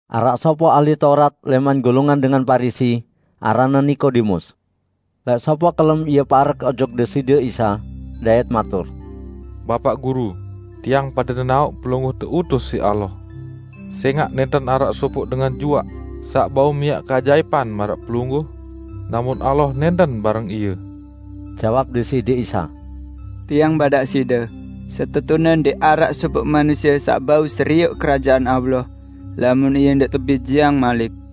Araq sopoq ahli Taurat lẽman golongan dengan Parisi aranne Nikodemus. Lẽq sopoq kelem ie parek ojok Deside Isa, dait matur, "Bapaq Guru, tiang pade nenaoq Pelungguh teutus siq Allah. Sẽngaq nẽnten araq sopoq dengan juaq saq bau miaq keajaipan maraq Pelungguh, lamun Allah nẽnten bareng ie." Jawab Deside Isa, "Tiang badaq side: Setetune ndẽq araq sopoq manusie saq bau serioq Kerajaan Allah lamun ie ndẽq tebijeang malik."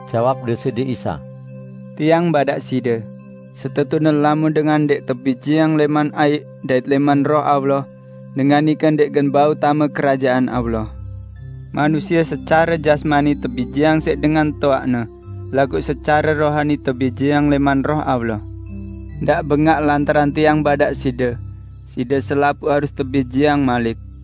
Jawab Deside Isa, "Tiang badaq side, setetune lamun dengan ndẽq tebijeang lẽman aiq dait lẽman Roh Allah, dengan nike ndẽq gen bau tame Kerajaan Allah. Manusie secare jasmani tebijeang siq dengan toaqne, laguq secare rohani tebijeang lẽman Roh Allah. Ndaq bengaq lantaran Tiang badaq side: Side selapuq harus tebijeang malik.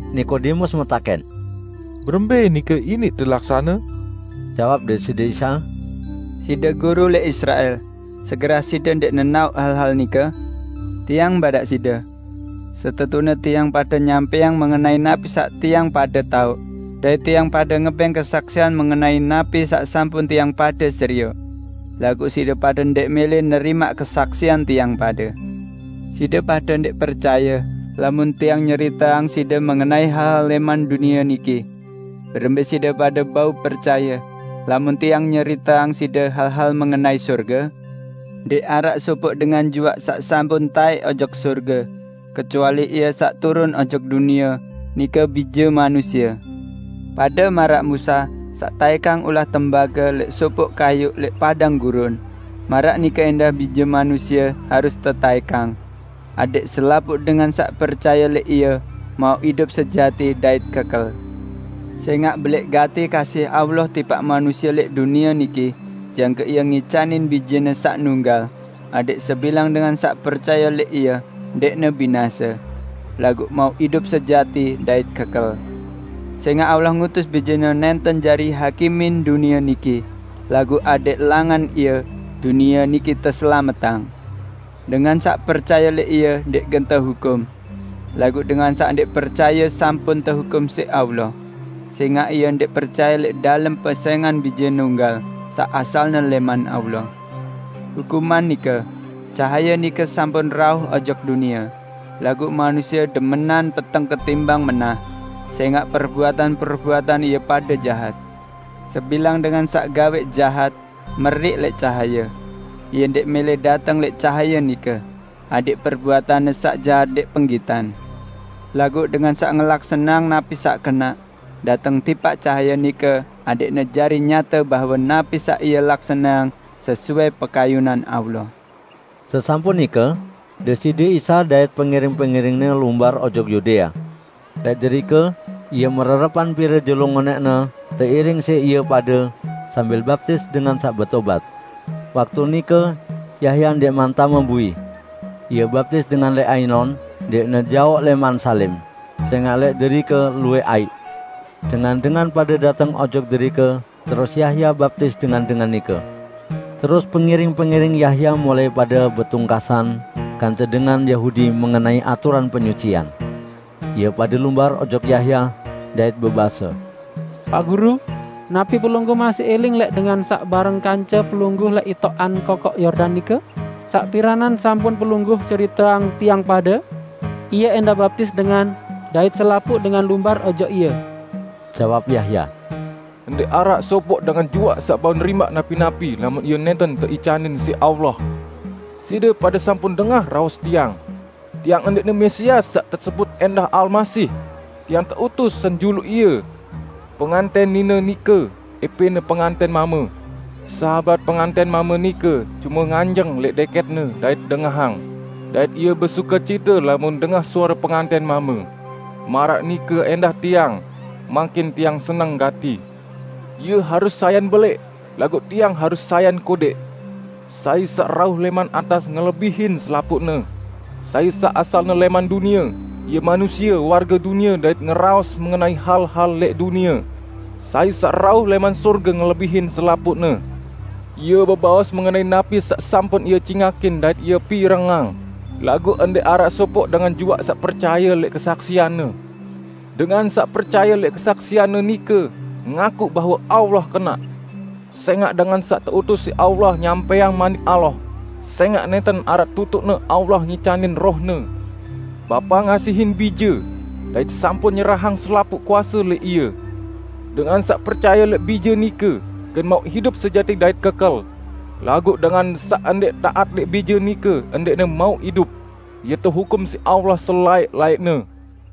Nikodemus metakẽn, "Berembẽ nike iniq telaksane?" Jawab Deside Isa, "Side guru lẽq Israel; segerah side ndẽq nenaoq hal-hal nike? Tiang badaq side: Setetune tiang pade nyampẽang mengenai napi saq tiang pade taoq, dait tiang pade ngebẽng kesaksian mengenai napi saq sampun tiang pade serioq; laguq side pade ndẽq mẽlẽ nerimaq kesaksian tiang pade. Side pade ndẽq percaye lamun Tiang nyeriteang side mengenai hal-hal lẽman dunie niki; berembẽ side pade bau percaye, lamun Tiang nyeriteang side hal-hal mengenai sorge? Ndẽq araq sopoq dengan juaq saq sampun taẽk ojok sorge, kecuali Ie saq turun ojok dunie, nike Bije Manusie. Pade maraq Musa saq taẽkang ulah tembage lẽq sopoq kayuq lẽq padang gurun, maraq nike ẽndah Bije Manusie harus tetaẽkang, adẽq selapuq dengan saq percaye lẽq Ie mauq idup sejati dait kekel. Sẽngaq belẽq gati kasih Allah tipaq manusie lẽq dunie niki, jangke Ie ngicanin Bije-Ne saq nunggal, adẽq sebilang dengan saq percaye lẽq Ie ndẽqne binase, laguq mauq idup sejati dait kekel. Sẽngaq Allah ngutus Bije-Ne nẽnten jari hakimin dunie niki, laguq adẽq langan Ie, dunie niki teselametang. Dengan saq percaye lẽq Ie ndẽq gen tehukum. Laguq dengan saq ndẽq percaye sampun tehukum siq Allah, sẽngaq ie ndẽq percaye lẽq dalem pesẽngan Bije Nunggal saq asalne lẽman Allah. Hukuman nike: Cahaye nike sampun rauh ojok dunie, laguq manusie demenan peteng ketimbang menah, sẽngaq perbuatan-perbuatan ie pade jahat. Sebilang dengan saq gawẽq jahat, meriq lẽq cahaye; ie ndẽq mẽlẽ dateng lẽq cahaye nike, adẽq perbuatanne saq jahat ndẽq penggitan. Laguq dengan saq ngelaksaneang napi saq kenaq, dateng tipaq cahaye nike adẽqne jari nyate bahwe napi saq ie laksaneang sesuai pekayunan Allah." Sesampun nike Deside Isa dait pengiring-pengiring-Ne lumbar ojok Yudea. Lẽq derike Ie mererepan pire jelo ngonẽqne teiring siq ie pade sambil baptis dengan saq betobat. Waktu nike Yahya ndẽqman tame bui. Ie baptis dengan lẽq Ainon, ndẽqne jaoq lẽman Salim, sẽngaq lẽq derike luwẽq aiq. Dengan-dengan pade dateng ojok derike terus Yahya, baptis dengan-dengan nike. Terus pengiring-pengiring Yahya mulai pade betungkasan kance dengan Yahudi mengenai aturan penyucian. Ie pade lumbar ojok Yahya, dait bebase, "Paq Guru, napi pelungguh masih iling lẽq dengan saq bareng kance pelungguh lẽq itoqan Kokoq Yordan nike saq piranan sampun pelungguh ceriteang tiang pade? Ie ẽndah baptis dengan, dait selapuq dengan lumbar ojok Ie!" Jawab Yahya, "Ndẽq araq sopoq dengan juaq saq bau nerimaq napi-napi lamun ie nẽnten teicanin siq Allah. Side pade sampun dengah raos tiang, 'Tiang ndẽqne Mesias saq tesebut ẽndah Almasih. Tiang teutus senjuluq Ie.' Pengantẽn nine nike ẽpẽne pengantẽn mame. Sahabat pengantẽn mame nike cume nganjeng lẽq dẽkẽtne dait dengahang, dait ie besukecite lamun dengah suare pengantẽn mame. Maraq nike ẽndah tiang. Mangkin tiang seneng gati. Ie harus sayan belẽq, laguq tiang harus sayan kodẽq." Sai saq rauh lẽman atas ngelebihin selapuqne; sai saq asalne lẽman dunie, ie manusie warge dunie dait ngeraos mengenai hal-hal lẽq dunie. Sai saq rauh lẽman sorge ngelebihin selapuqne. Ie bebaos mengenai napi saq sampun Ie cingakin dait Ie pirengang, laguq ndẽq araq sopoq dengan juaq saq percaye lẽq kesaksian-Ne. Dengan saq percaye lẽq kesaksian-Ne nike, ngakuq bahwe Allah kenaq. Sẽngaq dengan saq teutus siq Allah nyampẽang Manik Allah, sẽngaq nẽnten araq tutuqne Allah ngicanin Roh-Ne. Bapa ngasihin Bije, dait sampun nyerahang selapuq kuase lẽq Ie. Dengan saq percaye lẽq Bije nike gen mauq idup sejati dait kekel. Laguq dengan saq ndẽq taat lẽq Bije nike ndẽqne mauq idup. Ie tehukum siq Allah selaẽq-laẽqne.